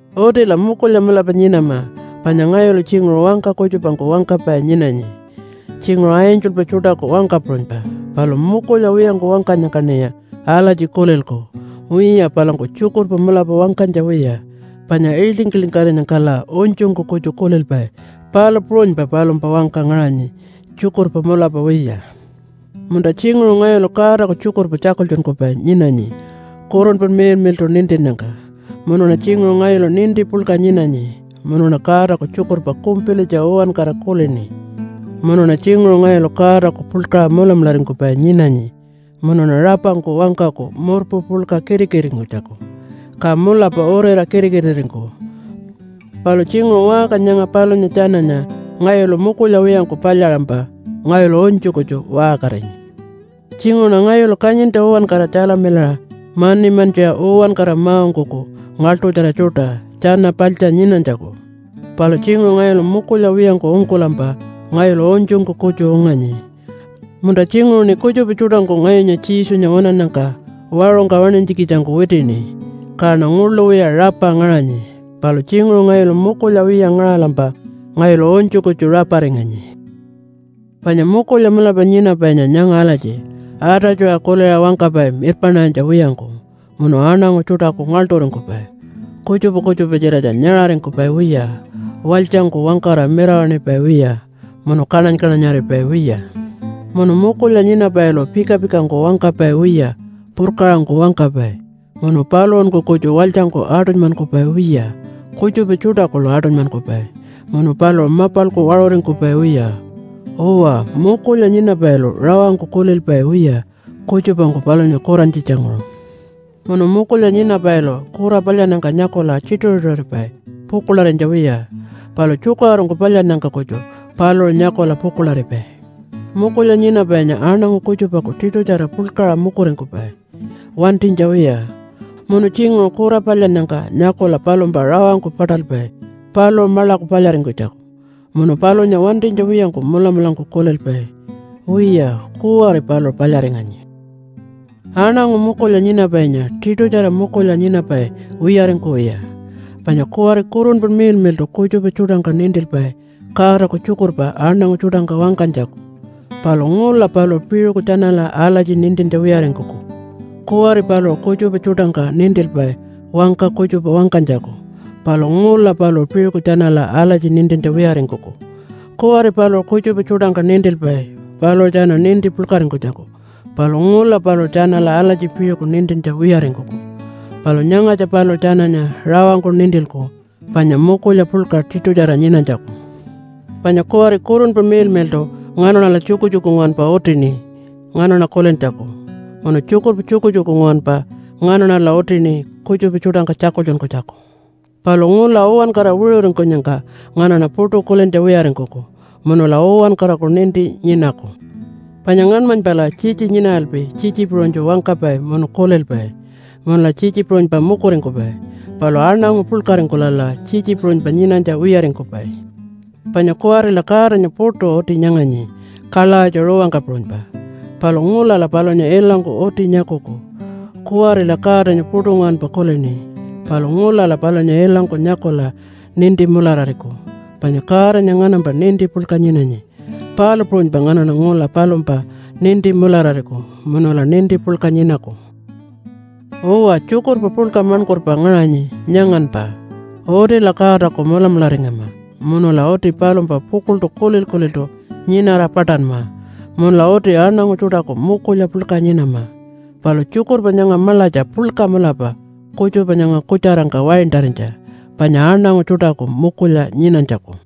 Utila mukulya mulapa nyinama. Panya ngayulu tjinguṟu wangka kutjupangku wangkapai nyinanyi, tjinguṟu angelpa tjuṯaku wangka puṟunypa. Palu mukulya wiyangku wangkanyangkaṉiya alatji kulilku, “Wiya, palangku tjukurpa mulapa wangkanytja wiya, panya ilting-iltingarinyangkala unytjungku kutju kulilpai, palu puṟunypa palumpa wangka ngaṟanyi tjukurpa mulapa wiya.” Munta, tjinguṟu ngayulu Godaku tjukurpa tjakultjunkupai nyinanyi Kurunpa Miḻmiḻṯu nintinnyangka. Munuṉa tjinguṟu ngayulu ninti puḻka nyinanyi, munuṉa Godaku tjukurpa kumpilitja uwankara kulini. Munuṉa tjinguṟu ngayulu Godaku puḻkaṟa mulamularingkupai nyinanyi munuṉa rapangku wangkaku murpu puḻka kitikitiringkunytjaku, ka mulapa uriṟa kitikitiringkuku. Palu tjinguṟu waṟka nyanga palunya tjananya ngayulu mukulya wiyangku palyaṟampa ngayulu unytju kutju waṟkarinyi. Tjinguṟuṉa ngayulu kanyintja uwankara tjalamilaṟa mani mantjiṟa uwankara ma-ungkuku ngaḻṯutjara tjuṯa tjana paḻtja nyinanytjaku. Palu tjinguṟu ngayulu mukulya wiyangku ungkulampa ngayulu unytjungku kutju unganyi. Munta tjinguṟuṉi kutjupa tjuṯangku ngayunya Jesunya waṉannyangka waṟungka waṉinytjikitjangku witini, kaṉa nguḻu wiya rapa ngaṟanyi. Palu tjinguṟu ngayulu mukulya wiya ngaṟalampa ngayulu unytju kutju raparinganyi. Panya mukulya mulapa nyinapainya nyanga alatji, atatjuṟa kuliṟa wangkapai mirpaṉarinytja wiyangku, munu aṉangu tjuṯaku ngaḻṯuringkupai, kutjupa kutjupa-tjiratja nyaṟaringkupai wiya, walytjangku wangkara mirawaṉipai wiya, munu kaṉany-kaṉanyaripai wiya. Munu mukulya nyinapailu pika-pikangku wangkapai wiya purkaṟangku wangkapai, munu paluṟunku kutju walytjangku aṯunymankupai wiya kutjupa tjuṯa kuḻu aṯunymankupai, munu paluṟu mapalku waṟuringkupai wiya. Uwa, mukulya nyinapailu rawangku kulilpai wiya kutjupangku palunya kurantjitjanguṟu. Munu mukulya nyinapailu kura palyannyangka nyakula tjituṟu-tjituṟuripai pukuḻarinytja wiya, palu tjukaṟurungku palyannyangka kutju paluṟu nyakula pukuḻaripai. Mukulya nyinapainya aṉangu kutjupaku tiṯutjara puḻkaṟa mukuringkupai wantinytja wiya. Munu tjinguṟu kura palyannyangka nyakula palumpa rawangku paṯalpai paluṟu maḻaku palyaringkunytjaku, munu palunya wantinytja wiyangku mulamulangku kulilpai, “Wiya kuwari paluṟu palyaringanyi.” Aṉangu mukulya nyinapainya tiṯutjara mukulya nyinapai wiyaringkuwiya. Panya kuwari Kurunpa Miḻmiḻṯu kutjupa tjuṯangka nintilpai Godaku tjukurpa aṉangu tjuṯangka wangkanytjaku, palu ngula paluṟu piṟuku tjanala alatji nintintja wiyaringkuku. Kuwari paluṟu kutjupa tjuṯangka nintilpai wangka kutjupa wangkanytjaku, palu ngula paluṟu piṟuku tjanala alatji nintintja wiyaringkuku. Kuwari paluṟu kutjupa tjuṯangka nintilpai paluṟu tjana ninti puḻkaringkunytjaku, palu ngula paluṟu tjanala alatji piṟuku nintintja wiyaringkuku. Palu nyangatja paluṟu tjananya rawangku nintilku panya mukulya puḻka tiṯutjara nyinanytjaku. Panya kuwari Kurunpa Miḻmiḻṯu nganaṉala tjukutjuku nguwanpa utini nganaṉa kulintjaku. Munu tjukurpa tjukutjuku nguwanpa nganaṉala utini kutjupa tjuṯangka tjakultjunkunytjaku. Palu ngula uwankara wiṟuringkunyangka nganaṉa puṯu kulintja wiyaringkuku, munula uwankaraku ninti nyinaku. Panya ngaṉmanypala tjitji nyinaralpi tjitji puṟunytju wangkapai munu kulilpai, munula tjitji puṟunypa mukuringkupai. Palu aṉangu puḻkaringkulala tjitji puṟunypa nyinanytja wiyaringkupai. Panya kuwarila Godanya puṯu uti nyanganyi kalawatja ruwangka puṟunypa. Palu ngulala palunya ilangku uti nyakuku. Kuwarila Godanya puṯu nguwanpa kulini, palu ngulala palunya ilangku nyakula ninti mularariku. Panya Godanya nganampa ninti puḻka nyinanyi, palu puṟunypa nganaṉa ngula palumpa ninti mularariku munula ninti puḻka nyinaku. Uwa, tjukurpa puḻka maṉkurpa ngaṟanyi nyanganpa: utila Godaku mulamularingama, munula uti palumpa pukuḻṯu kulil-kuliltu nyinara paṯanma, munula uti aṉangu tjuṯaku mukulya puḻka nyinama. Palu tjukurpa nyanga maḻatja puḻka mulapa kutjupa nyanga kutjarangka waintarinytja, panya aṉangu tjuṯaku mukulya nyinanytjaku.